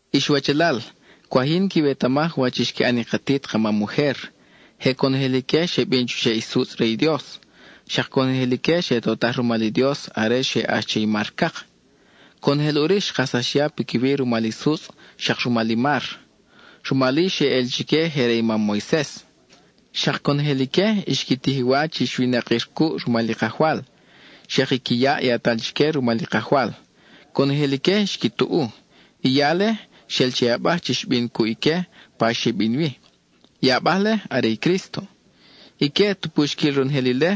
Ix wachalal, cwaj yin quiwetamaj wach xqui ʼan i katit ka mam ujer. Je conojel ique xe bin chuxeʼ i sutzʼ re i Dios; xak conojel ique xe totaj rumal i Dios are xe ʼax che i mar Cak. Conojel ʼuri xkajsax ya piquiwi rumal i sutzʼ, xak rumal i mar; rumal-i xeʼel chique je re i mam Moises. Xak conojel ique xqui tij i wa chi xwinakir cuʼ rumal i Kajwal. Xak i qui yaʼ yatal chique rumal i Kajwal, conojel ique xqui tuʼu. I yale, xel che i abaj chi xbin cuʼ ique pa xe bin wi; i abaj-le, are i Crísto. Ique tupu xquil ronojel ile,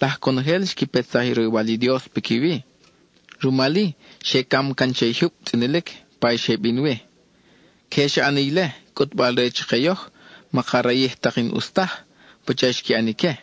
laj conojel xqui petsaj i roywal i Dios piquiwi. Rumal-i, xe cam can che i jyub tzʼinilic pa i xe bin wi. Queje xa ʼani ile, cʼutbal re chake yoj, maka rayij tak i n-ʼus taj, pacha xqui ʼan ique.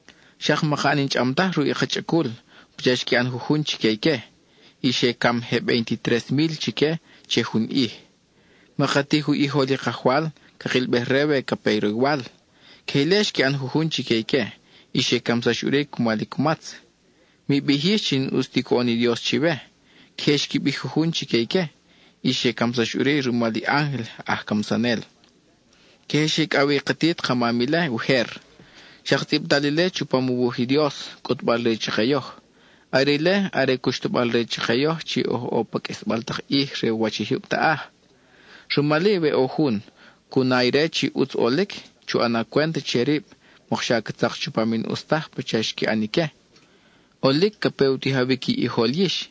Xak maka ʼan i n-chʼam taj ruʼ i ka chʼacul pacha xqui ʼan jujun chique ique, y xe cam je veintitres mil chique che jun ʼij. Maka tij u ʼijol i Kajwal cakilbej-re we ca pe roywal; queje ile xqui ʼan jujun chique ique, y xe camsax ʼuri cumal i cumatz. Mi bij yix chi n-ʼus ti coʼon i Dios chiwe; queje xqui bij jujun chique ique, y xe camsax ʼuri rumal i ángel aj camsanel. Queje xe icʼaw wi i katit ka mam ile ujer, xak tzʼibtal ile chupam u wuj i Dios, cʼutbal-re chake yoj. Are ile, are cuxtabal-re chake yoj chi oj ʼo pa qʼuisbal tak ʼij re u wach i jyub taʼaj. Rumal-i, we ʼo jun, cu na ire chi ʼutz ʼolic, chu ʼana cwent che rib, mokxa ca tzak chupam i n-ʼus taj pacha xqui ʼan ique. ʼOlic ca pe u tijawic i ʼijol yix,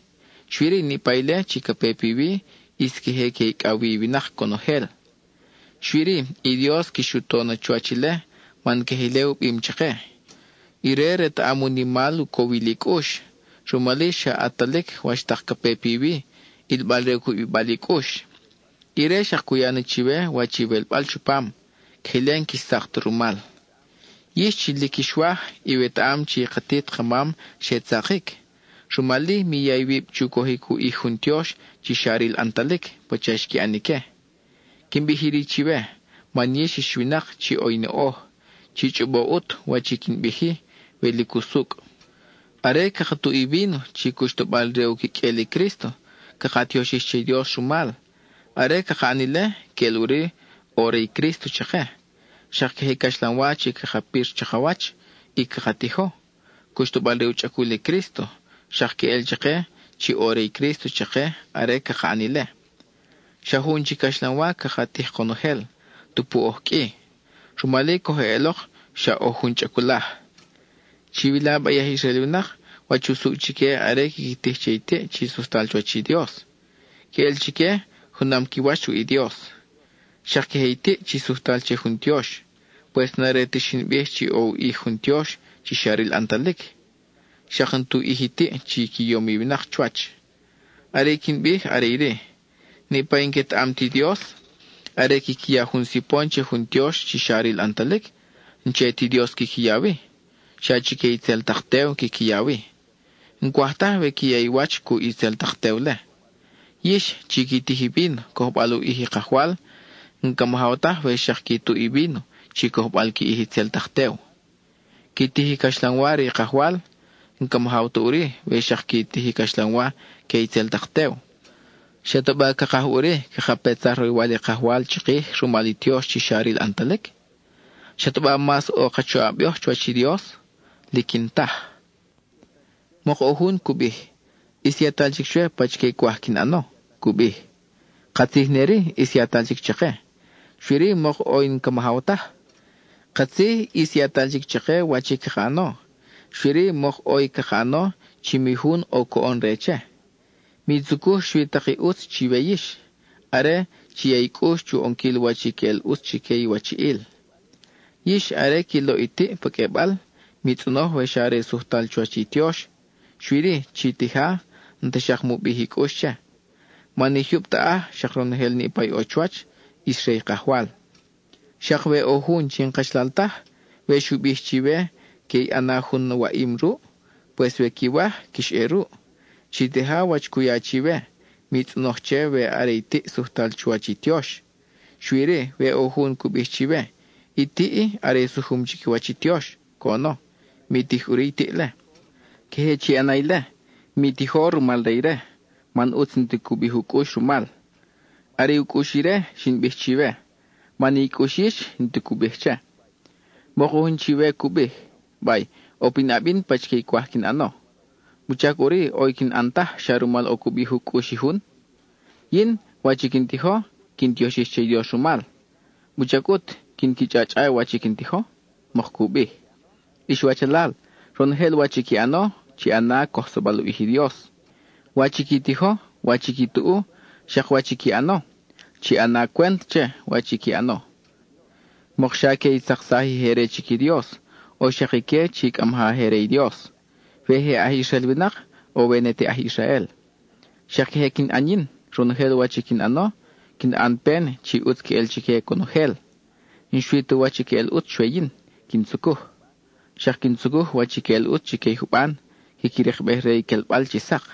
xui-ri, niʼpa ile chi ca pe piwi, ʼis queje que icʼaw wi i winak conojel. Xui-ri, i Dios quix u to na chuwach ile, man queje ile u bim chake. Ire retaʼam u nimal u cowil i cʼux, rumal-i xa ʼatalic wach tak ca pe piwi, ʼilbal re u cubibal i cʼux. Ire xak cu ya na chiwe wach iwelbal chupam, queje ile n-quix tzak ta rumal. Yix, chi lic quix waj, iwetaʼam chi i katit ka mam xe tzakic, rumal-i mi ya iwib chu cojic u ʼij jun tiox chi xa ril ʼantalic pacha xqui ʼan ique. Quin bij iri chiwe, man yix ix winak chi ʼo i noʼoj; chi chʼobo ʼut wach i quin bij-i, we lic usucʼ. Are caka tuʼ i víno chi cuxtabal re u quiqʼuel i Crísto, caka tioxij che i Dios rumal; are caka ʼan ile, queʼel ʼuri ʼo re i Crísto chake. Xak queje i caxlanwa chi caka pir chakawach y caka tijo, cuxtabal re u chʼacul i Crísto, xak queʼel chake chi ʼo re i Crísto chake are caka ʼan ile. Xa jun chi caxlanwa caka tij konojel, tupu oj qʼui; rumal-i coj eʼelok xa oj jun chʼaculaj. Chiwila ba i aj Israel winak, wach usucʼ chique are quiqui tij che i tiʼ chi sujtal chuwach i Dios; queʼel chique junam qui wach ruʼ i Dios. Xak queje i tiʼ chi sujtal che jun tiox. Pues n-are ta xin bij chi ʼo u ʼij jun tiox chi xa ril ʼantalic, xak n-tu ʼij i tiʼ chi qui yom i winak chuwach. Are i quin bij are iri: niʼpa i n-quetaʼam ti Dios, are quiqui ya jun sipon che jun tiox chi xa ril ʼantalic, n-che ti Dios quiqui ya wi, xa chique itzel tak tew quiqui ya wi. N-cwaj taj we qui ya i wach cuʼ itzel tak tew-le. Yix, chi qui tij i víno cojbal u ʼij i Kajwal, n-camajaw taj we xak qui tuʼ i víno chi cojbal qui ʼij itzel tak tew. Qui tij i caxlanwa re i Kajwal, n-ca majaw ta ʼuri we xak qui tij i caxlanwa que itzel tak tew. ¿Xataba cakaj ʼuri, caka petsaj roywal i Kajwal chikij rumal i tiox chi xa ril ʼantalic? ¿Xataba mas ʼo ka choʼab yoj chuwach i Dios? Lic n-taj. Mok ʼo jun cu bij: “ʼIs yatal chic chwe pachique cwaj quin ʼano,” cu bij. Katzij ne-ri, ʼis yatal chic chake, xui-ri mok ʼo i n-ca majaw taj. Katzij ʼis yatal chic chake wach i caka ʼano, xui-ri mok ʼo i caka ʼano chi mi jun ʼo coʼon re che. Mi tzucuj xui tak i ʼutz chiwe yix; are, chi ya i cʼux chu ʼonquil wach i queʼel ʼutz chique i iwachiʼil. Yix are qui loʼ i tiʼ pa qʼuebal, mi tzʼonoj we xa are sujtal chuwach i tiox, xui-ri, chi tija n-ta xak mu bij i cʼux che. Man i jyub taʼaj, xak ronojel niʼpa i ʼo chuwach, ʼis re i Kajwal. Xak we ʼo jun chi n-kachalal taj, we xu bij chiwe que i ʼana jun waʼim ruʼ, pues we quiwaj, quix ʼe ruʼ. Chi tija wach cu ya chiwe; mi tzʼonoj che we are i tiʼ sujtal chuwach i tiox. Xui-ri, we ʼo jun cu bij chiwe: “I tiʼ-i, are sujum chiquiwach i tiox,” coʼono, mi tij ʼuri i tiʼ-le. Queje chi ʼana ile, mi tijo, rumal re ire, man ʼutz n-ti cu bij u cʼux rumal. Are u cʼux ire, xin bij chiwe, man i cʼux yix n-ti cu bij che. Mok ʼo jun chiwe cu bij: “Bay, ʼo pinʼab yin pachique i cwaj quin ʼano, ¿wuchac ʼuri ʼo i n-quin ʼan taj, xa rumal ʼo cu bij u cʼux i jun? I yin, wach i quin tijo, quin tioxij che i Dios rumal, ¿wuchac ʼut quin qui chʼa-chʼa wach i quin tijo?” mok cu bij. Ix wachalal, ronojel wach i qui ʼano, chi ʼana cojsabal u ʼij i Dios: wach i qui tijo, wach i qui tuʼu, xak wach i qui ʼano. Chi ʼana cwent che wach i qui ʼano, mokxa que i tzaksaj i je re chic i Dios, o xak ique chi cʼa maja je re i Dios; we je aj Israel winak, o we ne te aj Israel. Xak queje quin ʼan yin; ronojel wach i quin ʼano, quin ʼan pen chi ʼutz queʼel chique conojel. N-xui ti wach i queʼel ʼutz chwe yin quin tzucuj, xak quin tzucuj wach i queʼel ʼutz chique i juban, quiqui rikbej re i quelbal chi sak.